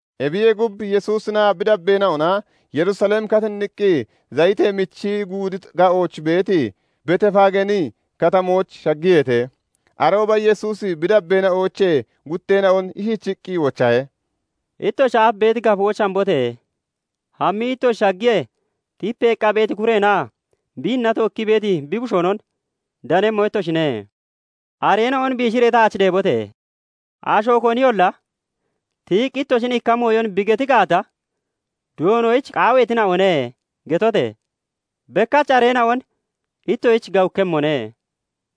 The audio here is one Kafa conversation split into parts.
Ebiyee gub, Yesuusinaa bi dabbeena'ona Yerusalem katinniqqi, Zayitee Michi Guudi ga'ooch beeti Beetefaageeni katamooch shaggiyeete. Arooba Yesuusi bi dabbeena'oochee gutteena'on ishichiqqi wochahe; "Ittoshi aaf beeti gafooch hambote! Hammii ittoshi shaggiyee, tipeeqqa beeti kureenaa biinna tookkii beeti bi bushoonon danemmo ittoshine; areena'on biishiree taach deebote! Asho koniyolla tiyiqqi ittoshin ikka mooyon bi geti gaata, 'Doonoyich qaaweetina'one' getote! Bekkach areena'on ittoshich gawukkemmone"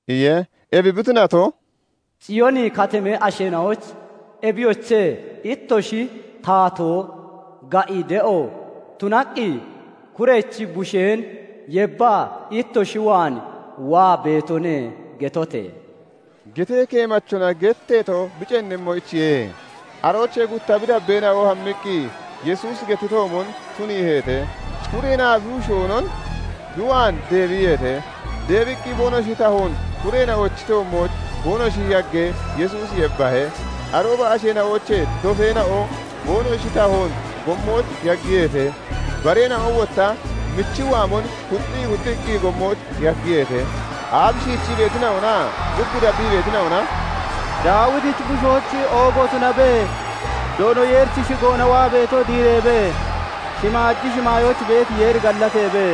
iye. Ebi bi tunato, "Ciyooni Katamee asheena'oyich 'Ebiyoche! Ittoshi taatoo ga'i de'o tunaqqi kurechi busheen yebbaa ittoshi waan waa beetone' getote!" gettee keemachona geteeto bi ceennemmoyichiye. Aroochee gutta bi dabbeena'o hammiqqi Yesuusi gettitoomon tuniiheete; kureenaa bi bushoonon bi waan deebiyeete. Deebiqqi boonoshi tahoon kureena'ochi toommooch boonoshi yaggee, Yesuusi yebbahe. Arooba asheena'oochee dofeena'o boonoshi tahoon gommooch yaggiyeete; bareena'o wotta michi waamon kuxxii kuxxiqqi gommooch yaggiyeete. Aaf shiichii beetina'onaa gub dabbii beetina'ona "Daawitichi bushoyich oogo tunabe! Doono Yeerichi shigoona waa beeto diireebe! Shimaaji shimaayooch beeti Yeeri gallateebe!"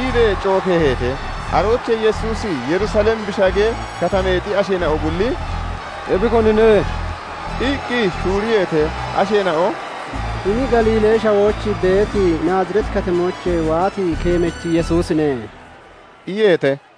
iibee cookeeheete. Aroochee Yesuusi Yerusalem bi shaggee, katameexi asheena'o bulli "Ebi konine?" iqqi shuuriyeete. Asheena'o "Hini Galiilee Shawooch beeti Naazireeti Katamoochee waati keemachi Yesuusine" iyeete.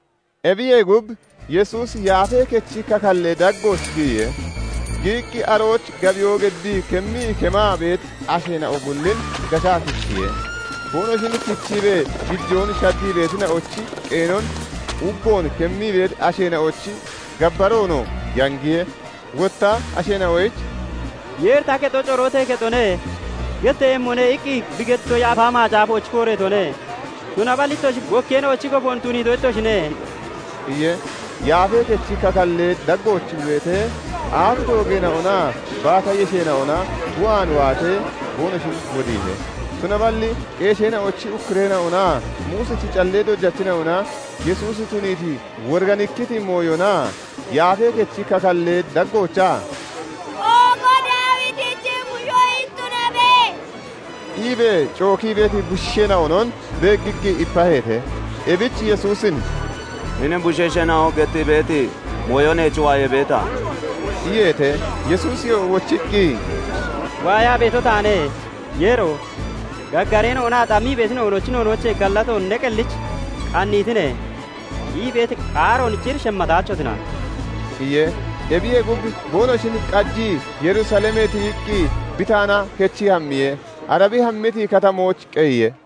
Ebiyee gub, Yesuusi Yaafee Kechi kakall daggooch giyiye. Giyiqqi, arooch gabiyoo geddii kemmii kemaa beeti asheena'o bullin gashaa kichiye. Boonoshin kichiibee gijoon shaddii beetina'ochi qeenon, uggon kemmii beeti asheena'ochi gabbaroonoo yangiye. Wotta asheena'oyich "Yeeri 'Ta kexo "Corootee kexoone" getteeyemmone' iqqi bi gettito Yaafa Macaafooch kooreetone; tunaballi ittoshi 'Bokkeena'ochi gofoon' tuniito ittoshine" iye. Yesuusi Yaafee Kechi kakallee daggooch bi beetee, aaf doogeena'onaa baata yesheena'ona bi waan waatee, boonoshin wodiihe. Tunaballi qeesheena'ochi ukkureena'onaa Muusichi callee dojachina'ona Yesuusi tuniiti woriganikkiti mooyonaa Yaafee Kechi kakallee daggoochaa "Oogo Daawitichi bushoyich tunabe!" iibee cookii beeti bushiisheena'onon beeggiqqi ipaheete. Ebich Yesuusin "Hini bushiisheena'o gettii beeti mooyo neech waayee beeta?" iyeete. Yesuusiyoo wochiqqi, "Waayaa beeto taane; 'Yeero! Gaggareena'onaa xammii beetina'onochi noonoochee gallatoon ne qellich qanniitine' ii beeti qaaroon cir shemmataachotina" iye. Ebiyee gub, boonoshin qajii Yerusalemee tiyiqqi Bitaana kechii hammiye; ara bi hammiti katamooch qeyiye.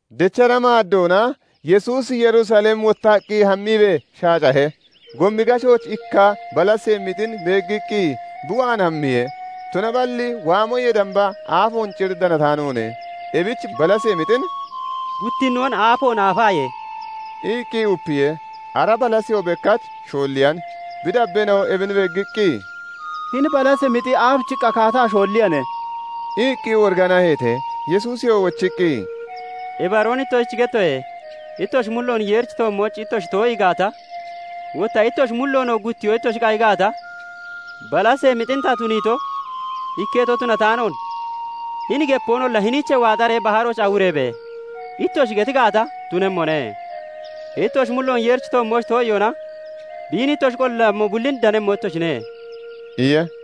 Dechra maaddoona Yesuusi Yerusalem wottaqqi hammiibee shaacahe. Gomi gashooch ikka balasee mixin beeggiqqi bi waan hammiye; tunaballi waamoyee damba aafoon cir danataanoone. Ebich balasee mixin "Guttinnoon aafoon aafaaye!" iqqi upiye. Ara balaseyoo bekkach shoolliyan. Bi dabbeena'o ebin beeggiqqi, "Hini balasee mixi aabichiqqa kaata shoolliyane?" iqqi woriganaheete. Yesuusiyoo wochiqqi, "Ibaroon ittoshich gettoye; ittoshi mulloon Yeerichi toommooch ittoshi too'ii gaata, wotta ittoshi mulloonoo guttiyoo ittoshi qayi gaata, balasee mixin ta tuniito ikketo tunataanoon, hini gepoonolla 'Hiniichee waaxaree baharooch awureebe!' ittoshi geti gaata, tunemmone. Ittoshi mulloon Yeerichi toommooch too'iyoona biin ittoshi qollammo bullin danemmo ittoshine" iye.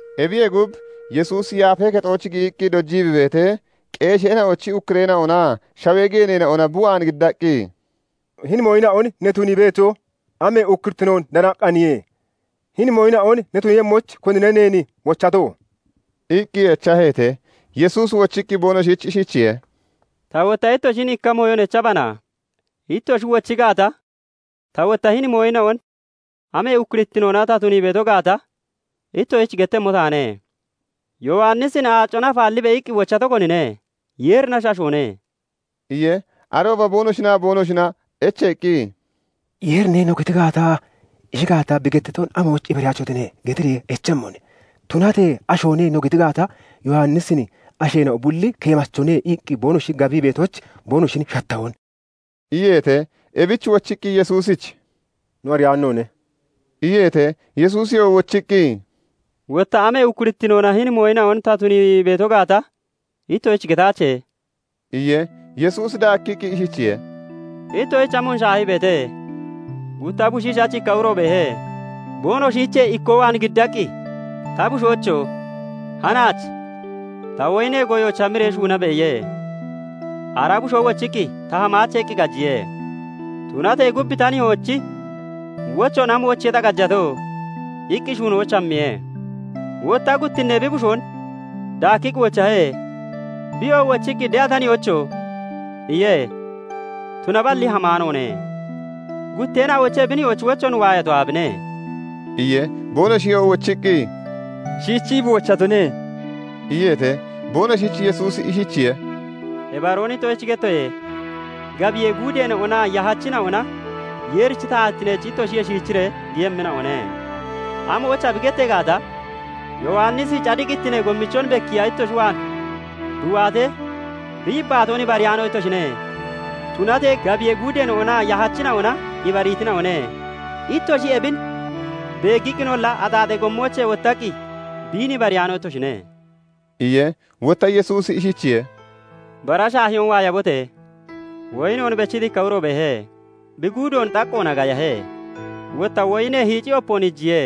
Ebiyee gub, Yesuusi Yaafee Kexooch giyiqqi dojii bi beetee, qeesheena'ochi ukkureena'onaa shawee geeneena'ona bi waan giddaqqi, "Hini mooyina'on ne tunii beeto, amee ukkurittinoon danaqqaaniye? Hini mooyina'on ne tuniiyemmoyich konine neen wochato?" iqqi echaheete. Yesuusi wochiqqi boonoshich ishichiye:- "Ta wotta ittoshin ikka mooyon echabana; ittoshi wochi gaata, ta wotta hini mooyina'on amee ukkurittinoona ta tunii beeto gaata ittoshich gettemmo taane. Yowannisin 'Aacona afaallibe!' iqqi wochato konine? Yeerinashi, ashoone?" iye. Arooba boonoshinaa boonoshina echeeqqi, " 'Yeerine' no geti gaata, 'Ishi gaata, bi gettiton amoyich ibariyaachotine?' getiree echemmone. Tunatee 'Ashoone' no geti gaata, Yowannisin asheena'o bulli "Keemachone" iqqi boonoshi gabii beetoyich boonoshin shattahone" iyeete. Ebich wochiqqi Yesuusich "No ariyaano noone" iyeete. Yesuusiyoo wochiqqi, "Wotta amee ukkurittinoona hini mooyina'on ta tunii beeto gaata ittoshich getaache" iye. Yesuusi daakkiqqi ishichiye:- "Ittoshich amoon shaahii beete? Gutta bushiishachi ikka uro beehe. Boonoshiichee ikkoo waan giddaqqi, 'Ta bushoocho! hanaach ta woyinee goyooch hamiree shuunabe!' iye. "Ara bushoo wochiqqi, 'Ta hamaache' iqqi qajiye. Tunatee gub 'Ta nihoochi wochoon amoyichiye ta qajato?" iqqi shuunoyich hammiye. "Wotta guttinnee bi bushoon daakkiqqi wochahe. Biyoo wochiqqi 'De'a ta nihoocho!' iye; tunaballi hamaanoone. "Gutteena'oochee bi nihoochi wochoon waayato aabine?" iye. Boonoshiyoo wochiqqi, "Shichii bi wochatone" iyeete. Boonoshich Yesuusi ishichiye:- "Ibaroon ittoshich gettoye; gabiyee guudeena'onaa yahachina'ona Yeerichi taatittineech ittoshiyee shiichiree giyemmina'one. 'Amoyicha?' bi gettee gaata, Yowannisi cadiqittinee gommichon bekkiiya ittoshi waan bi waatee, bi yibbaatoon ibariyaano ittoshine; tunatee gabiyee guudeena'onaa yahachina'ona ibariitina'one. Ittoshi ebin beeggiqqinolla, axaaxee gommoochee wottaqqi biin ibariyaano ittoshine" iye. Wotta Yesuusi ishichiye:- "Bara shaahiyoon waayabote! Woyinoon bechiti ikka uro beehe. Bi guudoon xaqqoona gayahe; wotta woyinee hiicci opoon iijiye;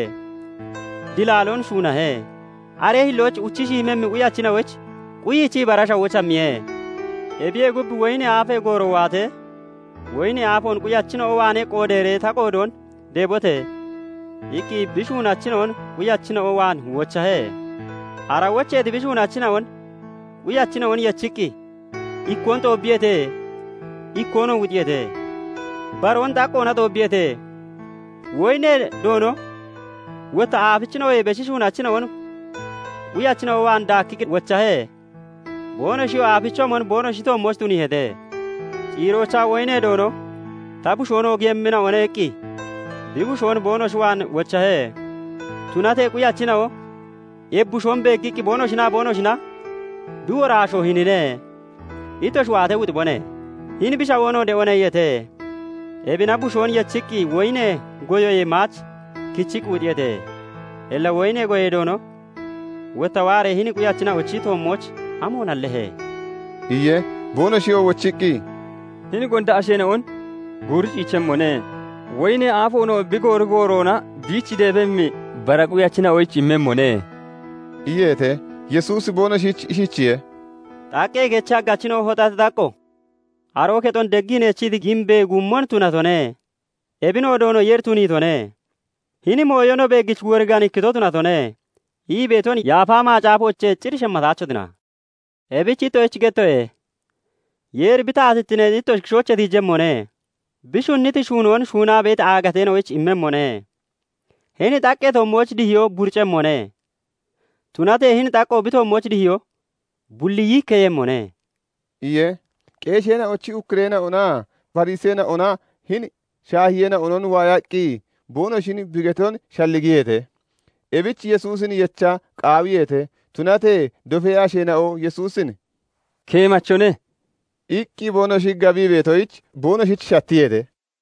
dilaaloon shuunahe; aree hillooch uchi shiimemmi quyachina'oyich quyichii, bara shawooch hammiye. "Ebiyee gub, woyinee aafee gooro waatee, 'Woyinee aafoon quyachina'o waanee qoodeeree ta qoodoon deebote!' iqqi bi shuunachina'on quyachina'o waan wochahe. "Ara wocheeti bi shuunachina'on quyachina'on yechiqqi ikkoon xoobbiyeete; ikkoonoo wuxiyeete; baroon xaqqoona xoobbiyeete. Woyinee doono wotta aafichina'oyee beshi shuunachina'on quyachina'o waan daakkiqqi wochahe. Boonoshiyoo aafichoomon boonoshi toommooch tuniiheete. Ciiroochaa woyinee doono 'Ta bushoon oogiiyemmina'one' iqqi bi bushoon boonoshi waan wochahe. "Tunatee quyachina'o ebi bushoon beeggiqqi boonoshinaa boonoshina 'Bi woraashoo hinine. Ittoshi waatee wuxibone. Hini bi shawoonoo de'one' iyeete. Ebina bushoon yechiqqi, woyinee goyoyee maach kichiqqi wuxiyeete. "Illa woyinee goyee doono wotta waaree hini quyachina'ochi toommooch amoon hallehe?" iye. Boonoshiyoo wochiqqi, "Hini gonda asheena'on guuri ciichemmone; woyinee aafoonoo bi goori gooroona biich deebemmi bara quyachina'oyich immemmone" iyeete. Yesuusi boonoshich ishichiye:- " 'Xaqqee kechi haggachina'o hoxati xaqqo, aroo kexon deggii neechiti giimbee guummon tunatone. Ebinoo Doono Yeeri tuniitone. Hini mooyo no beeggich woriganikkito tunatone' ii beeton Yaafa Macaafoochee cir shemmataachotina? "Ebich ittoshich gettoye; Yeeri bi taatittineen ittoshi kishoochee tiijemmone; bi shunniti shuunoon shuunaa beeti aagatoyich immemmone[. Hini xaqqee toommooch dihiyo buricemmone; tunatee hini xaqqo bi toommooch dihiyo bulli yiikkeeyemmone]" iye. Qeesheena'ochi ukkureena'onaa Fariseena'ona hini shaahiyeena'on waayaqqi boonoshin bi geton shalligiyeete. Ebich Yesuusin yecha qaawiyeete; tunatee dofee asheena'o Yesuusin "Keemachone" iqqi boonoshi gabii beetoyich boonoshich shattiyeete.